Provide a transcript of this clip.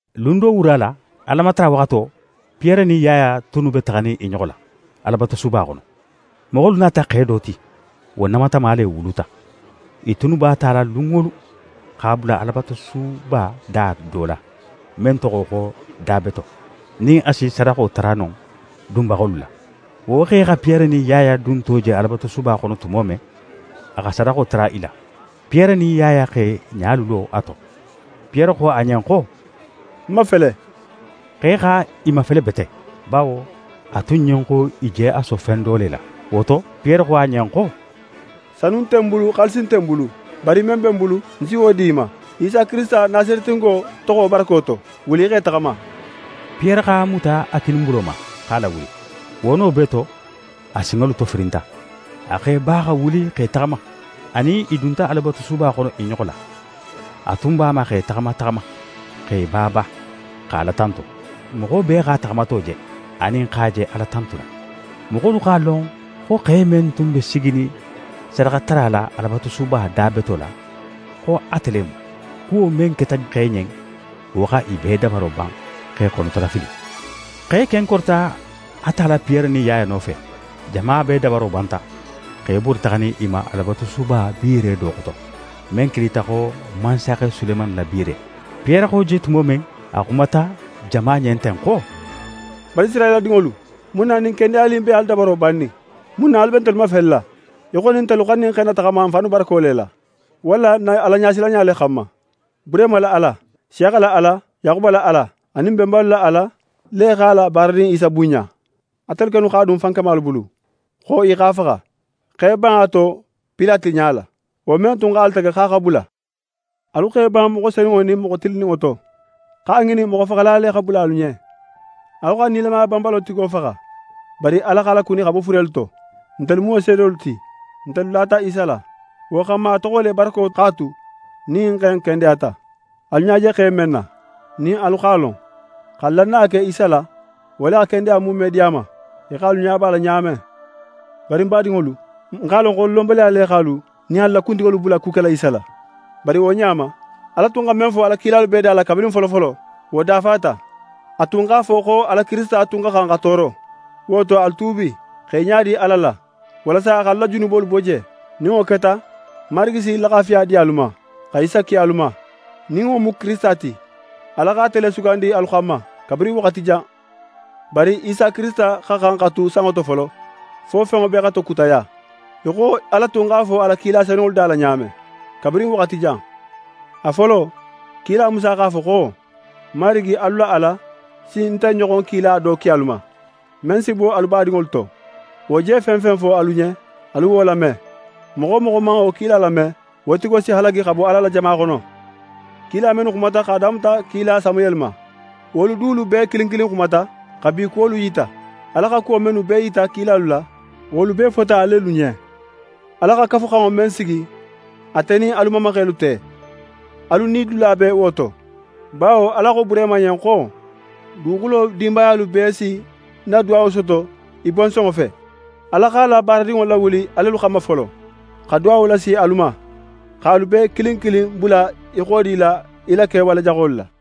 Lun do wura la, Alamatara waxato, Piyere nin Yaya tunnu be taxanin i ɲoxo la Alabatusuba xono. Moxolu nata xe do ti. Wo namatama le wuluta. I tunnu b'a tala lun wo lun, x'a bula Alabatusuba da do la, men toxo xo Da Beto, nin a si sadaxo tara non dunbaxolu la. Wo xe xa Piyere nin Yaya dunto je Alabatusuba xono tumo men, a xa sadaxo tara i la. Piyere nin Yaya x'e ɲalu lo a to. Piyere xo a ɲen xo: «N mafele!» Xe xa i mafele bete, bawo a tun ɲen xo i je a so fen do le la. Wo to, Piyere xo a ɲen xo: «Sanu nte ń bulu, xaalisi nte ń bulu, bari men be ń bulu, ń si wo di í ma. Isa Kirisita, Nasaretingo toxo barako to, wuli í x'é taxama.» Piyere x'a muta a kininbulo ma, x'a lawuli. Wo no bee to, a sinŋolu tofirinta. A x'é ba, xa wuli x'é taxama. A nin i dunta Alabatusuba xono i ɲoxo la. A tun b'a ma x'é taxama taxama, x'é ba ba, xa Ala tantu. Moxo bee x'a taxamato je, anin x'a je Ala tantula. Moxolu x'a lon xo xe men tun be siginin sadaxatara la Alabatusuba Da Beto la, xo ate le mu. Kuwo men keta xe ɲen, wo xa i bee dabaro ban x'e xonotolafili. Xe ken korita a tala Piyere nin Yaya nofe. Jama bee dabaro banta, x'e bori taxanin i ma Alabatusuba biire do xoto, men kilita xo «Mansaxe Sulemani la biire.» Piyere xa wo je tumo men, a xumata jama ɲen ten xo: «Banisirayila dinŋolu, mun na ɲin kendeyali in be alu dabaro bannin? Mun na alu be ntelu mafelela í xo nin ntelu xa ɲin xe in nataxama n fannu barako le la, walla n na Alaɲasilanɲa le xanma? Burehima la Ala, Nsiyaxa la Ala, Yaxuba la Ala, anin n benbalu la Ala le x'a la baaradin Isa bunɲa. Atelu kennu x'a dun fankamalu bulu, xo i x'a faxa, x'e ban a to Pilate ɲala, wo men tun x'a latege xo a xa bula. Alu x'e ban moxo Senunŋo nin moxo Tilinninŋo to, x'a ŋinin moxofaxala le xa bula alu ɲen. Alu xa nilamaya banbalo tigo faxa. Bari Ala x'a lakuni xa bo furelu to. Ntelu mu wo seedolu ti. Ntelu lata Isa la. Wo xanma, a toxo le barako x'a tu, nin ɲin xe in kendeyata; alu ɲa je xe in men na, nin alu x'a lon. Xa lannaya ke Isa la, wo le xa kendeya muume di a ma, í xo alu ɲa b'a la ɲa men. «Bari ń badinŋolu, ń x'a lon xo lonbaliya le x'alu nin alu la kuntigolu bula ku kela Isa la. Bari wo ɲa ma, Ala tun xa men fo a la kilalu bee da la kabirin folofolo, wo dafata. A tun x'a fo xo a la Kirisita tun xa xan xa tooro. Wo to, alu tuubi, x'e ɲadi Ala la, walasa a x'alu la junubolu bo je. Nin wo keta, Marigi si laxafiya di alu ma, xa Isa ki alu ma, nin wo mu Kirisita ti. Ala xa ate le sugandi alu xanma, kabirin waxati jan. Bari Isa Kirisita xa xan xa tu sanŋo to folo, fo fenŋo bee xa tokutaya, í xo Ala tun x'a fo a la kila senunŋolu da la ɲa men, kabirin waxati jan. A folo, kila Musa x'a fo xo: “Marigi, alu la Ala, si nte ɲoxon kila do ki alu ma, men si bo alu badinŋolu to. Wo je fen fen fo alu ɲen, alu wo lame. Moxo wo moxo man wo kila lame, wo tigo si halagi xa bo Ala la jama xono.” Kila mennu xumata, x'a damuta kila Samuyeli ma, wolu dulu bee kilin kilin xumata, xa bi kuwolu yita. Ala xa kuwo mennu bee yita kilalu la, wolu bee fota alelu ɲen. Ala xa Kafuxanŋo men sigi ate nin alu mamaxelu te, alu nidula be wo to, bawo Ala xo Burehima ɲen xo: “Duguxulo dinbayalu bee si ń na duwawo soto í bonsonŋo fe.” Ala x'a la baaradinŋo lawuli alelu xanma folo, xa duwawo lasi alu ma, x'alu bee kilin kilin bula í xodila í la kewale jaxolu la.»